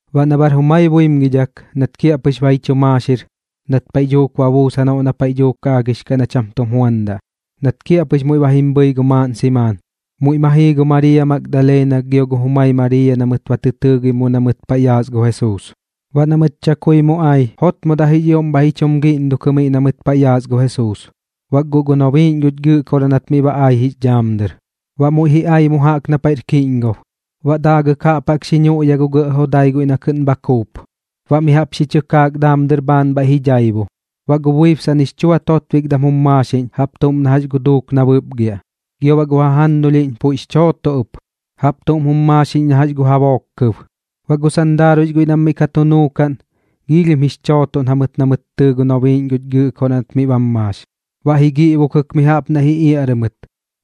Baꞌ na bar jumai buimgidhak nat kiaꞌpɨx ba ji chu maaxir, nat paiꞌ dhuuk ba buus janoꞌ na paiꞌ dhuuk aagix kaꞌ na cham tum juandaꞌ, nat kiaꞌpɨx muiꞌ ba jim bhɨi gu maaꞌn simaan, muiꞌ ma jii gu Mariiya Magdaleena gio gu jumai Mariiya na mɨt ba tɨ tɨɨgim mu na mɨt paiꞌ yaas gu Jesuus. Baꞌ na mɨt chakui mu ai, jotmodaꞌ jix ioꞌm bhaiꞌ ji chum giꞌndukɨ miꞌ na mɨt paiꞌ yaas gu Jesuus. Bak guꞌ gu nobiiꞌñ guch Gɨꞌkoraꞌ nat miꞌ ba ai jix dhaam dɨr, baꞌ muiꞌ ji ai mu jaꞌk na paiꞌr kiꞌñgob, baꞌ daagɨk jaꞌp jaꞌk xi nuꞌya gu gɇꞌ jodai guiꞌ na kɨꞌn bha kuup, baꞌ mi jaꞌp xi chɨkaak daam dɨr bhaan bhaiꞌ ji dhaibu. Baꞌ gu buibsaꞌn jix chua totbikdam jum maaxiꞌñ jaꞌp tuꞌm na jax gu duuk na bɨpgiaꞌ, gio baꞌ gu jajannulhiꞌñ puiꞌx chooto ɨp, jaꞌp tuꞌm jum maaxiꞌñ na jax gu jabook kɨb. Baꞌ gu sandaaruiꞌx guiꞌ nam miꞌ ka tu nuukaꞌn, giilhim jix chootoꞌn jamɨt na mɨt tɨɨ gu nobiiꞌñ guch Gɨꞌkoraꞌ nat miꞌ bam maax, baꞌ ji giꞌbokɨk mi jaꞌp naiꞌ ji iaꞌrɨ mɨt,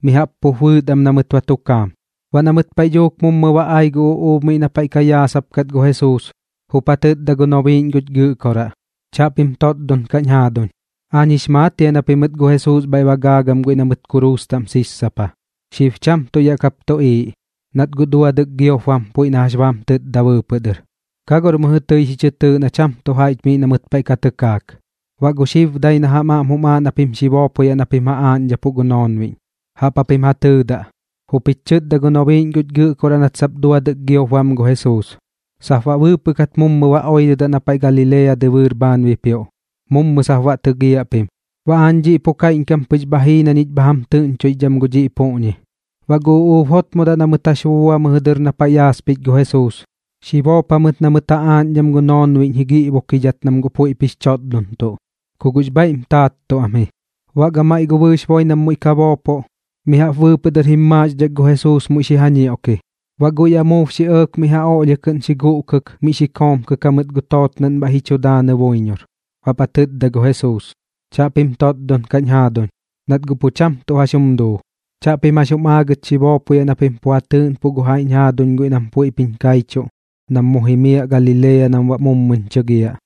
mi jaꞌp pup bɨɨt am na mɨt ba tu kaam. Baꞌ na mɨt paiꞌ dhuuk mummɨ ba ai gu uꞌuub miꞌ na paiꞌ ka yaasapkat gu Jesuus, jup ja tɨtda gu nobiiꞌñ guch Gɨꞌkoraꞌ: ―Chaꞌpim totdon kaꞌñ jaaduñ. Aañ jix maat jia na pimɨt gu Jesuus bhaiꞌ ba gaagam guiꞌ na mɨt kuruus taꞌm sissapa. Xib cham tuꞌ yaꞌ kap tuꞌiiꞌ, nat guꞌ duadɨk giop bam puiꞌ na jax ba jam tɨtda bɨɨpɨꞌ dɨr. Ka gor mɨjɨ tɨi xi chɨ tɨɨꞌ na cham tu jaiꞌch miꞌ na mɨt paiꞌ ka tɨkaak. Baꞌ gu xib dai na jam aꞌm jum aaꞌ na pim xi boopoyaꞌ na pim ja aaꞌñdhapuꞌ gu noonbiꞌñ, jaꞌp japim ja tɨɨdaꞌ: “Jup jich chɨtda gu nobiiꞌñ guch Gɨꞌkoraꞌ nat sap duadɨk giop bam gu Jesuus, sap baꞌ bɨɨpɨꞌ kat mummɨ ba oirɨdaꞌ na paiꞌ Galilea dɨbɨɨr bhaan bipioꞌ, mummɨ sap baꞌ tɨgiaꞌ pim.” Baꞌ aañ dhiꞌ pu kaiꞌñkam pɨx bha jii na ñich bha jam tɨꞌñchoixdham gu dhiꞌ puꞌñi. Baꞌ gu uꞌuub jotmodaꞌ na mɨt jax bubua mɨjɨ dɨr na paiꞌ ka yaaspich gu Jesuus, xi boop jamɨt na mɨt ja aaꞌñdham gu noonbiꞌñ ji giꞌbokidhat nam guꞌ puiꞌp jix chotdontuꞌ, ku guꞌx bhaiꞌm taattuꞌ am ji. Baꞌ gamaiꞌ gu bɨɨx boi nam muiꞌ ka boopoꞌ, mi jaꞌp bɨɨpɨꞌ dɨr jim maaxdhak gu Jesuus muiꞌ xi ja ñioꞌki. Baꞌ guiꞌ amuub xi ɇɇk mi jaꞌp ja oꞌlhia kɨꞌn xi guꞌkɨk miꞌ xi komkɨk jamɨt gu tootnaꞌn bhaiꞌ ji chu daanɨ buiñor. Baꞌp ja tɨtda gu Jesuus: ―Chaꞌpim totdon kaꞌñ jaaduñ, nat guꞌ pu cham tuꞌ jax jum duu. Chaꞌpim jax jum aagɨt xi boopoyaꞌ na pim pu ja tɨɨꞌnpuꞌ gu jaiꞌñ jaaduñ guiꞌ nam puiꞌp jiñ kaichuꞌ nam mu jimiaꞌ Galilea nam baꞌ mummɨñ chɨgiaꞌ.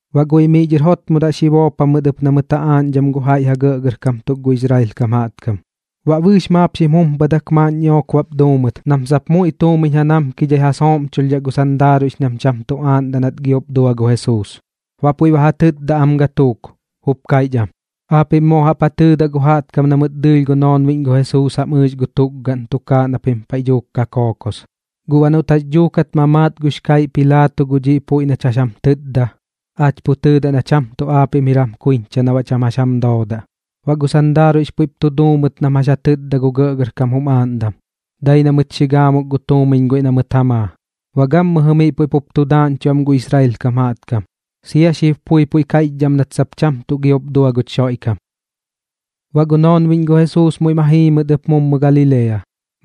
Baꞌ guiꞌ miꞌ dhɨr jotmodaꞌ xi boop jamɨt ɨp na mɨt ja aaꞌñdhaꞌ gu jaiꞌ ja gɇꞌgɇrkam tuk gu Israel kam jaꞌtkam. Baꞌ bɨɨx maap xim jumpadak maaꞌn ñiꞌook bap duu mɨt nam sap muiꞌ tuumiñ ja namkidhai ja sooꞌmchulhdhaꞌ gu sandaaruiꞌx nam cham tu aaꞌndaꞌ nat giop dua gu Jesuus. Baꞌ puiꞌ ba ja tɨtda am gatuuk, jup kaiꞌch am: ―Aapiꞌm moo jaꞌp ja tɨɨdaꞌ gu jaꞌtkam na mɨt dɨɨlh gu noonbiꞌñ gu Jesuus jam ɨɨx gu tukgaꞌn tukaaꞌ na pim paiꞌ dhuuk ka kookos. Guꞌ baꞌ noꞌt jax dhuukat ma maat gux kaiꞌ Pilaato gu dhiꞌ puiꞌ nach jax jam tɨtda, aach pu tɨɨdaꞌ na cham tuꞌ aapiꞌm jir jam kuiñcha na baꞌ cham jax jam doodaꞌ. Baꞌ gu sandaaruiꞌx puiꞌp tu duu mɨt nam jax ja tɨtda gu gɇꞌgɇrkam jum aaꞌndam, dai na mɨt xi gaamuk gu tuumiñ guiꞌ na mɨt ja maa. Baꞌ gammɨjɨ miꞌ puiꞌ pup tu daaꞌñchuꞌ am gu Israel kam jaꞌtkam, sia gu xib pui puiꞌ kaiꞌchdhaꞌ am nat sap cham tuꞌ giop dua guch Xoiꞌkam. Baꞌ gu noonbiꞌñ gu Jesuus muiꞌ ma jii mɨt ɨp mummɨ Galilea,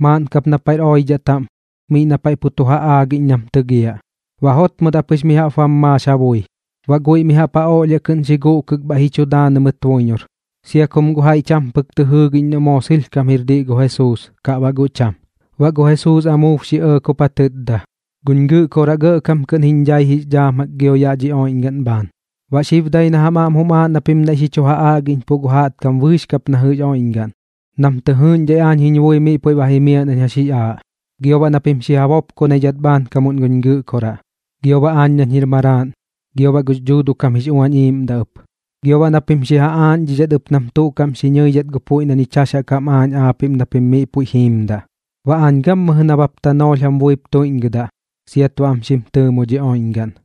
maaꞌn kap na paiꞌr oidhaꞌ taꞌm miꞌ na paiꞌ tu ja aagiꞌñ nam tɨgiaꞌ. Baꞌ jotmodaꞌ pɨx mi jaꞌp bam maax ja bui, baꞌ guiꞌ mi jaꞌp ja oꞌlhia kɨꞌn xi guꞌkɨk bhaiꞌ ji chu daanɨ mɨt buiñor, sia kum guꞌ jaiꞌ cham pɨk tɨ jɨɨgiꞌñ noꞌ moo sɨlhkam jir diꞌ gu Jesuus kaꞌ baꞌ guꞌ cham. Baꞌ gu Jesuus amuub xi ɇɇk jup ja tɨtda: ―Guñ Gɨꞌkoraꞌ gɇꞌkam kɨꞌn jiñ dhai jix dhaam jaꞌk gio yaꞌ dhi oiꞌñgaꞌn bhaan. Baꞌ xib dai na jam aꞌm jum aaꞌ na pim naiꞌ xi chu ja aꞌgiꞌñpuꞌ gu jaꞌtkam bɨɨx kap na jɨꞌx oiꞌñgaꞌn nam tɨ jɨɨꞌñdhai aañ jiñ bui miꞌ puiꞌ jimiaꞌ nañ jax jix aaꞌ, gio baꞌ na pim xi ja bopkonidhat bhaankam guñ Gɨꞌkoraꞌ, gio baꞌ aañ nañ jir Maraaꞌn, gio baꞌ gux Dhuuduꞌ kam jix Uañ Iiꞌmdaꞌ ɨp. Gio baꞌ na pim xi ja aaꞌñdhidhat ɨp nam tuꞌ kaꞌm xi nɨidhat gu puiꞌ na ñich jax jaꞌk jam aaꞌñ aapiꞌm na pim miꞌ puiꞌ jiimdaꞌ. Baꞌ aañ gammɨjɨ nabap tanoolh jam buip tuiꞌñgɨdaꞌ siat baꞌ am xim tɨɨmo dhi oiꞌñgaꞌn.